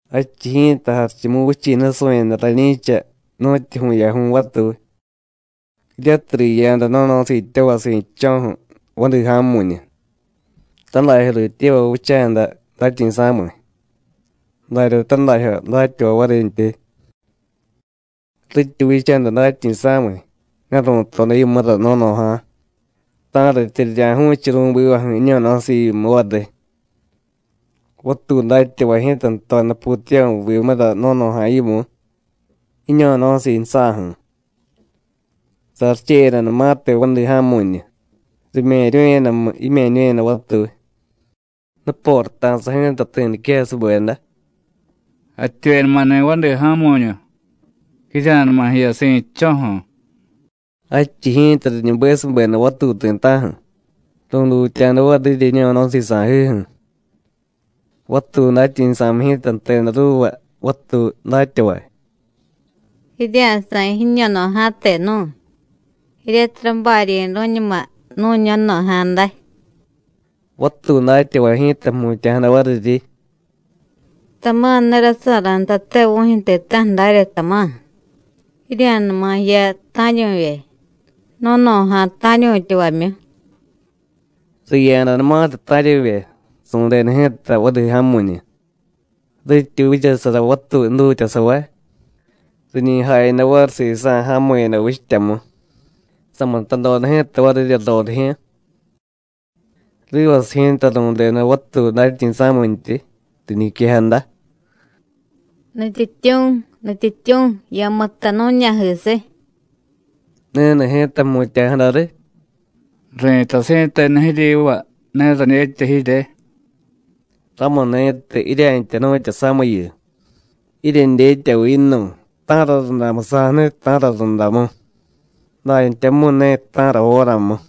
“Jadchiy ji̱ta Jarichumuvichi̱ nusu̱yada rañi̱cha nu̱tyu vu̱yaju̱y vatuy, jiryatiy riya̱da no̱no̱siityavay si̱dcho̱ju̱ vadi ja̱mu̱ñu. Tadajyo rityevay vicha̱da datyi̱sa̱miy, darya tadajyo datyavay varintyi. Rityi vicha̱da datyi̱sa̱miy ne ru̱toda yimura no̱no̱ja̱ ta̱ratya rirya̱ju̱chiy ru̱bivaju̱ jiño̱no̱siivyimu variy. Vatuy datyavay ji̱ta jtoda putiyavu̱vimura no̱no̱ja̱ yimu, jiño̱no̱siiju̱sa̱ju̱. Saricheyadanumatiy vadi ja̱mu̱ñu, rime̱ryu̱yadamu jime̱ñu̱yada vatuy. Nuporata̱sa ji̱ta ti̱ niquejasubeda: ¡Jativyenumani̱ vadi ja̱mu̱ñu! ¡Jirya̱numa jiya si̱dcho̱ju̱! Jadchiy ji̱ta riñubesubeda vatuy ti̱ta̱ju̱, ru̱dutya̱da varirya jiño̱no̱siiy sa̱jiju̱. Vatuy datyi̱sa̱miy ji̱ta jteda ruuva vatuy datyavay: Jirya̱sa̱y jiño̱no̱ja̱te nu̱y, jiryatiy rabaryi̱ru̱ñuma nu̱ño̱no̱ja̱ day. Vatuy datyavay ji̱ta jmutya̱jada variryi: Tama̱ ne rasa̱ra̱ ntate vu̱jyu̱ ti̱ta̱ju̱ darya, tama̱, jirya̱numa jiya ta̱ryu̱vye, no̱no̱ja̱ ta̱ryu̱tyavamyu. Riya̱danumatiy ta̱ryu̱vye, su̱deda ji̱ta vadi ja̱mu̱ñu. Rityi vichasara vatuy jdutyasavay, riñi jayada variy sisa̱ ja̱mu̱yada vichtyamu. Samutadoda ji̱ta varirya rorijyu̱. Rivasiy ji̱ta ru̱deda vatuy datyi̱sa̱mintyi, riñiquejada: ¡Nutyityu̱, Nutyityu̱, ya̱mutta nu̱ña̱jisiy! Ni̱ni̱ ji̱ta jmutya̱jada riy: Ri̱tay si̱tenu jiryiva: Ne radyetya jirye. Ramuni̱tiy jiryentya jnu̱tya samiyu, jiryedyetyaviy yinu̱y ta̱ra rundamu sa̱jniy, ta̱ra rundamu, dantyamu̱y ne ta̱ra jóramu.”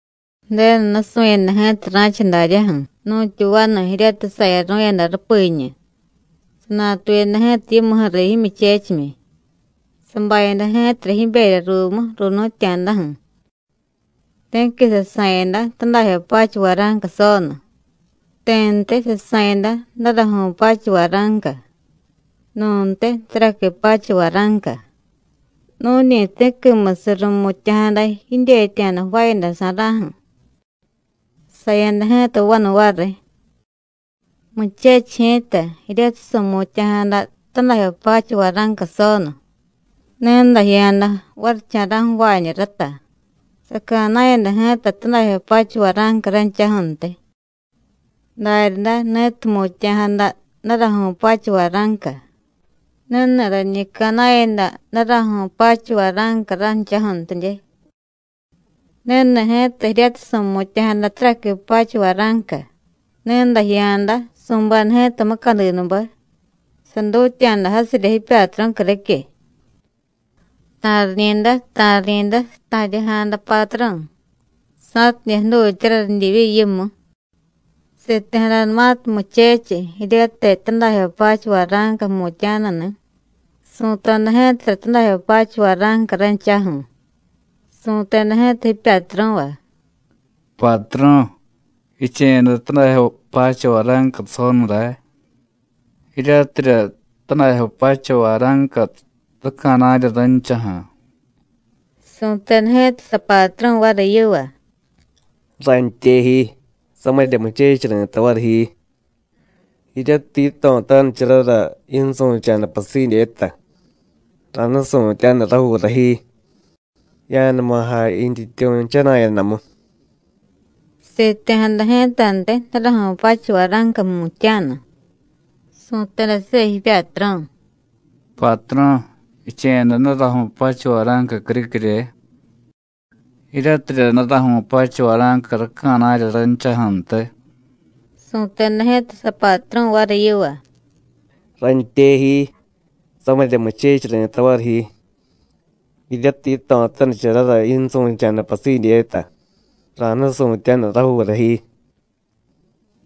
“Ju̱denu nusu̱yada ji̱ta ra̱cha daryaju̱ nu̱tyu vanu jiryatiy sayaru̱yada rupiñu. Sanatuyada ji̱ta yimuju̱ riy jimyuchechimyi, sabayada ji̱tara jiberya ruumu ru̱nu̱tya̱daju̱. Ti̱qui sasa̱yada tadajyo pacha vara̱nca sonu, ti̱ntiy sasa̱yada daraju̱y pacha vara̱nca, nu̱ntiy taraqui pacha vara̱nca, nu̱ñi ti̱quimusiy ru̱mutya̱jada jidyetya̱da jvaayada sa̱ra̱ju̱. Saya̱da ji̱ta vanu variy. Muchechiy ji̱ta, jiryatiy su̱mutya̱jada tadajyo pacha vara̱nca sonu, ni̱day jiya̱da varicha̱ra̱ju̱ ju̱vaañu rata, saca̱na̱yada ji̱ta tadajyo pacha vara̱nca ranchaju̱ntiy. Daryaday, ni̱tiy jmutya̱jada daraju̱y pacha vara̱nca, ni̱ni̱ rañi ca̱na̱yada daraju̱y pacha vara̱nca ranchaju̱ntidye. Ni̱ni̱ ji̱ta jiryatiy su̱mutya̱jada taraqui pacha vara̱nca, ni̱day jiya̱da, su̱beda ji̱ta mucadinube, sadutya̱da jasirya jipyatru̱ criquiy. Ta̱riñi̱day, ta̱riñi̱day, sata̱rya̱jada patru̱ sa̱tidye jdutyara ridyivyi yimu. Siti̱jadanumatiy muchechiy jiryatiy tadajyo pacha vara̱nca jmutya̱nuni̱, su̱toda ji̱tara tadajyo pacha vara̱nca ranchaju̱, su̱teda ji̱ta jipyatru̱va: Patru̱, jiche̱yada tadajyo pacha vara̱nca sonu ray. Jiryatirya tadajyo pacha vara̱nca ráca̱na̱rya ranchaju̱. Su̱teda ji̱ta sapatru̱ variy yiva: ¡Rantye ji, samirya muchechiy ri̱tay variy ji! Jiryatiy yito̱tanicharara yinsu̱cha̱da pasidyeta, ra̱nusu̱tyaniy rajuura ji. Ya̱numa jay yintyityu̱ jchana̱yadamu. Siti̱jada ji̱tantiy daraju̱y pacha vara̱nca jmutya̱nu, su̱teda siva jipyatru̱: Patru̱, jiche̱yada daraju̱y pacha vara̱nca criquirye. Jiryatirya daraju̱y pacha vara̱nca ráca̱na̱rya ranchaju̱ntiy. Su̱teda ji̱ta sapatru̱ variy yiva: ¡Rantye ji, samirya muchechiy ri̱tay variy ji! Jiryatiy yito̱tanicharara yinsu̱cha̱da pasidyeta, ra̱nusu̱tyaniy rajuura ji.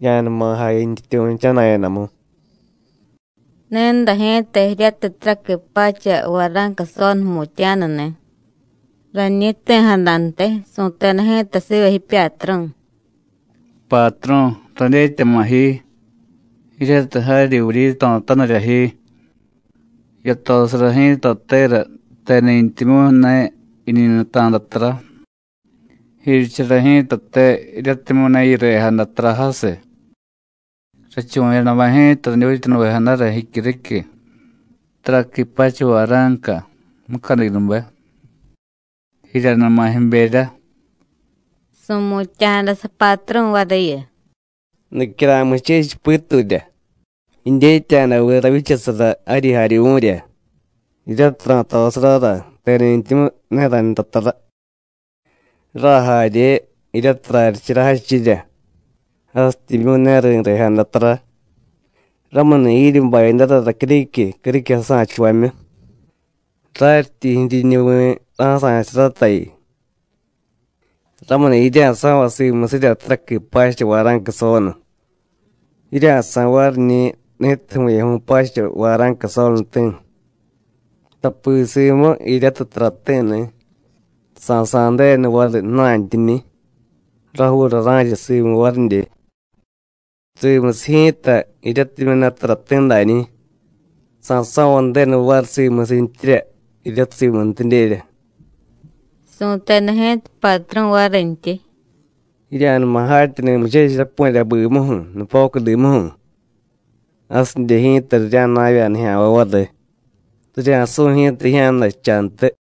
Ya̱numa jay yintyityu̱ jchana̱yadamu. Ni̱day ji̱ta jiryatiy taraqui pacha vara̱nca sonu jmutya̱nuni̱, rañi jti̱jadantiy, su̱teda ji̱ta siva jipyatru̱: Patru̱, radyetyama̱ ji, jiryatiy jaryi vuryito̱tanirya ji. Yatosara ji̱tatera teni̱ntimyu̱ ne jiñi nuta̱da tara, jiryichara ji̱tate jiryatimyu̱ ne yirejada tara jasiy. Rachuvu̱yadamu ji̱ta radyutyanuvejadara jicyuriquiy, taraqui pacha vara̱nca, mucadinube. Jiryanuma jiberya. Su̱mutya̱jada sapatru̱ variyu: ¡Nicyara̱y muchechiy piturya! ¿Jidyetya̱da viy ravyichasara jaryi jaryuvu̱rya, jiryatiy ra̱tosarara teni̱ntimyu̱ ne raynta tara, rajarye, jiryatiy raryichara jadchirya, jasityimyu̱ ne ri̱rejada tara? Ramuni̱, jiryi bayadara racyuriquiy criquiy jasa̱chuvamyu, raryityi jiryiñuvi̱ ra̱sa̱chusaratayu. Ramuni̱ jirya̱so̱vay simusirya taraqui pacha vara̱nca sonu, jirya̱sa̱y variñi̱, ni̱tiy vu̱yaju̱y pacha vara̱nca sonuti̱. Tapi simu jiryatiy tarati̱ni̱, sa̱sa̱y Ju̱denu variy ju̱na̱ntyiñi̱, rajuura ra̱cha simu varidye. Simusiy ji̱ta jiryatimyu̱ ne tarati̱ dañi̱, sa̱so̱vay Ju̱denu variy simusintyirya jiryatiy simuntidyerya. Su̱teda ji̱ta patru̱ varintyi: Jirya̱numa jatyani̱ muchechiy rapu̱rya bimuju̱, nupocudimuju̱. Jasidye ji̱ta rirya̱jna̱vya̱ nijya̱nvay variy, rirya̱su̱y ji̱ta jijya̱dajchantiy.”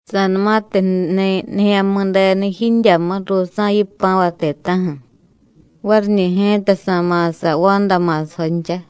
“Sa̱numatiy jniy Nijya̱mi̱denu jidyamu ruusa̱ yipa̱vay ti̱ta̱ju̱, variñi̱ ji̱ta sa̱ma̱sa vanda ma̱sajoncha.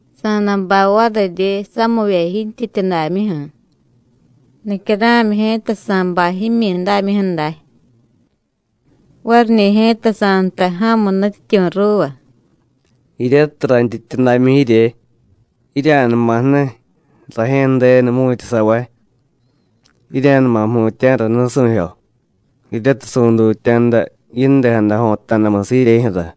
Sa̱day bay variryi samivye yintyityudamyuju̱, nicyara̱myi ji̱ta sa̱bay jimyidámyuju̱ day. Variñi̱ ji̱ta sa̱jtay ja̱mu nutyityu̱ ruuva: Jiryatiy rayntyityudamyu jirye: Jirya̱numa jniy, Rajye̱ Ju̱denu jmu̱tyasavay. Jirya̱numa jmutya̱ra nusu̱jyo, jiryatiy su̱dutya̱da yindejada jo̱ta̱damusiy jiryejyu̱ra.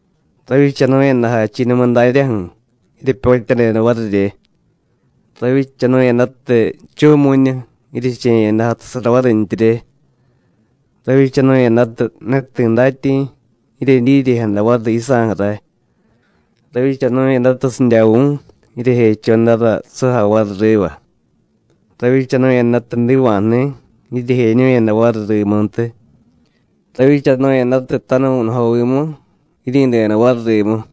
Ravyichanu̱yada jachi̱numu daryaju̱, jiryepyotyadeda varirye; ravyichanu̱yadatiy jchu̱mu̱ñu, jiryeche̱yada jatusara varintyirye; ravyichanu̱yadatiy ne ti̱ datyi̱, jiryedyiryejada variy yisa̱ju̱ ray. Ravyichanu̱yadatiy sidyavu̱, jiryejechodara sujay variy riva; ravyichanu̱yadatiy jdiva̱jni̱, jiryejeñu̱yada variy rimuntiy; ravyichanu̱yadatiy tanuvu̱nujovimu, jiryi̱deda variy rimu.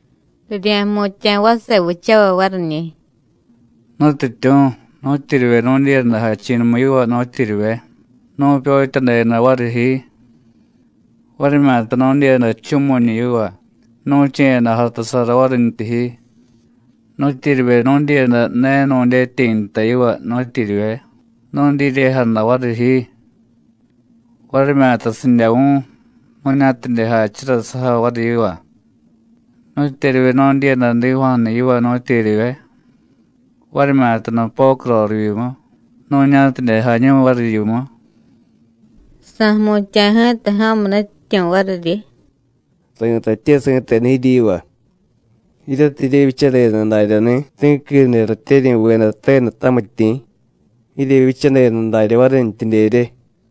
Rirya̱jmutya̱ vase vichavay variñi̱: Nutyityu̱, ¿nu̱tyeryivye nu̱dyiyada jachi̱numu yiva, nu̱tyeryivye? nu̱pyotyadeda variy ji, varimyata nu̱dyiyada jchu̱mu̱ñu yiva, nu̱che̱yada jatusara varintyi ji. ¿Nu̱tyeryivye nu̱dyiyada ne nu̱dyetyi̱ nta yiva, nu̱tyeryivye? nu̱dyiryejada variy ji, varimyata sidyavu̱, nu̱ña̱tidye jachura sujay variy yiva. ¿Nu̱tyeryivye nu̱dyiyada jdiva̱jni̱ yiva, nu̱tyeryivye? varimyata nupocu rorivyimu, nu̱ña̱tidye jañu̱y variy yimu. Sa̱jmutya̱ ji̱ta ja̱mu nutyityu̱ variryi: Ri̱tatye si̱tenu jiryiva: Jiryatiy jiryevyichadeda daryani̱ ti̱quide ratyeryi̱veda tenu tamityi̱, jiryevyichadeda darya varintyidyerye.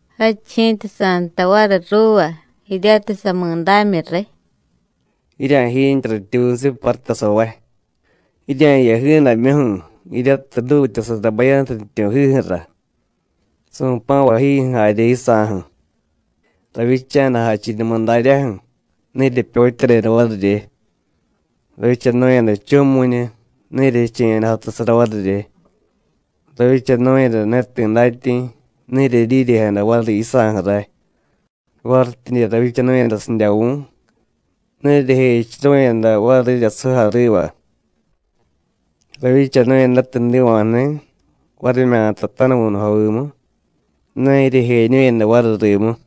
Jadchiy ji̱ta sa̱jtay variy ruuva jiryatiy samidámyu riy: ¡Jirya̱jiintye ratyuunusiy parutasavay! ¡Jirya̱jiya jiidamyuju̱, jiryatiy jdutyasara bayantu nutyityu̱jiju̱ra, su̱pa̱vayjiju̱ jarye yisa̱ju̱! Ravyicha̱da jachi̱numu daryaju̱, ne jiryepyotyadeda varirye; ravyichanu̱yada jchu̱mu̱ñu, ne jiryeche̱yada jatusara varirye. Ravyichanu̱yada ne ti̱ datyi̱, ne jiryedyiryejada variy yisa̱ju̱ ray; varityidye ravyichanu̱yada sidyavu̱, ne jiryejechuru̱yada varirya sujay riva; ravyichanu̱yadatiy jdiva̱jni̱, varimyata tanuvu̱nujovimu, ne jiryejeñu̱yada variy rimu.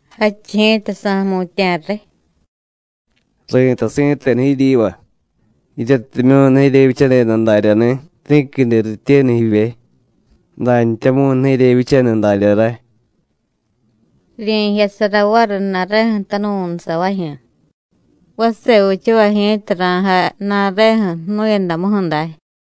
Jadchiy ji̱ta sa̱jmutya̱riy: Ri̱tay si̱tenu jiryiva: Jiryatimyu̱ ne jiryevyichadeda daryani̱ ti̱quide rityenu jivye, dantyamu̱y ne jiryevyichaniy darya ray. Rirye̱jyasara variy ju̱na̱reju̱ tanuvu̱nusavajyu̱. Vase vichavay ji̱ta ra̱jay ju̱na̱reju̱ jnu̱yadamuju̱ day.”